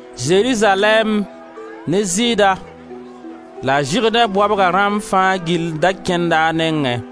Zerizalɛɛm ne Zɩɩda la Zʋrdẽ baobga rãmb fãa gill da kẽnda a nengẽ.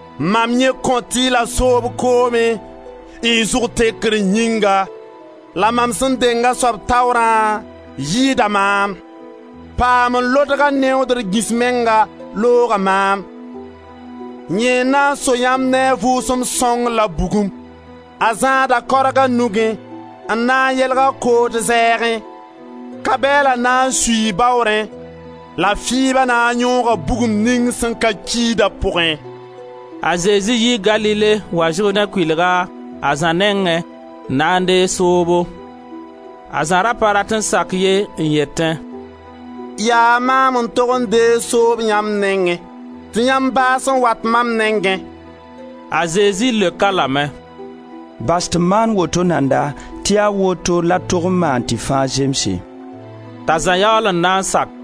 Mam yẽ kõt-y la soob koomẽ y zʋg tekr yĩnga la mam sẽn deng a soab taoorã yɩɩda maam; paam n lodg a neodr gĩs menga looga maam; yẽ na n soo yãmb ne a Vʋʋsem Sõng la bugum. A zãada kaorg a nugẽ n na n yelg a kood zɛɛgẽ; ka-bɛɛla na n suii baoorẽ, la fɩɩba na n yõoga bugum ning sẽn ka kiida pʋgẽ.» A Zezi yii Galile n wa Zʋrdẽ kʋɩlga, a Zã nengẽ, n na n deeg soobo. A Zã ra pa rat n sak ye, n yetẽ: «Yaa maam n tog n deeg soob yãmb nengẽ, tɩ yãmb baas n wat mam nengẽ!» A Zezi leok-a lame: «Bas tɩ m maan woto nanda tɩ yaa woto la d tog maan tɩ fãa zemse.» T'a Zã yaool n na n sak.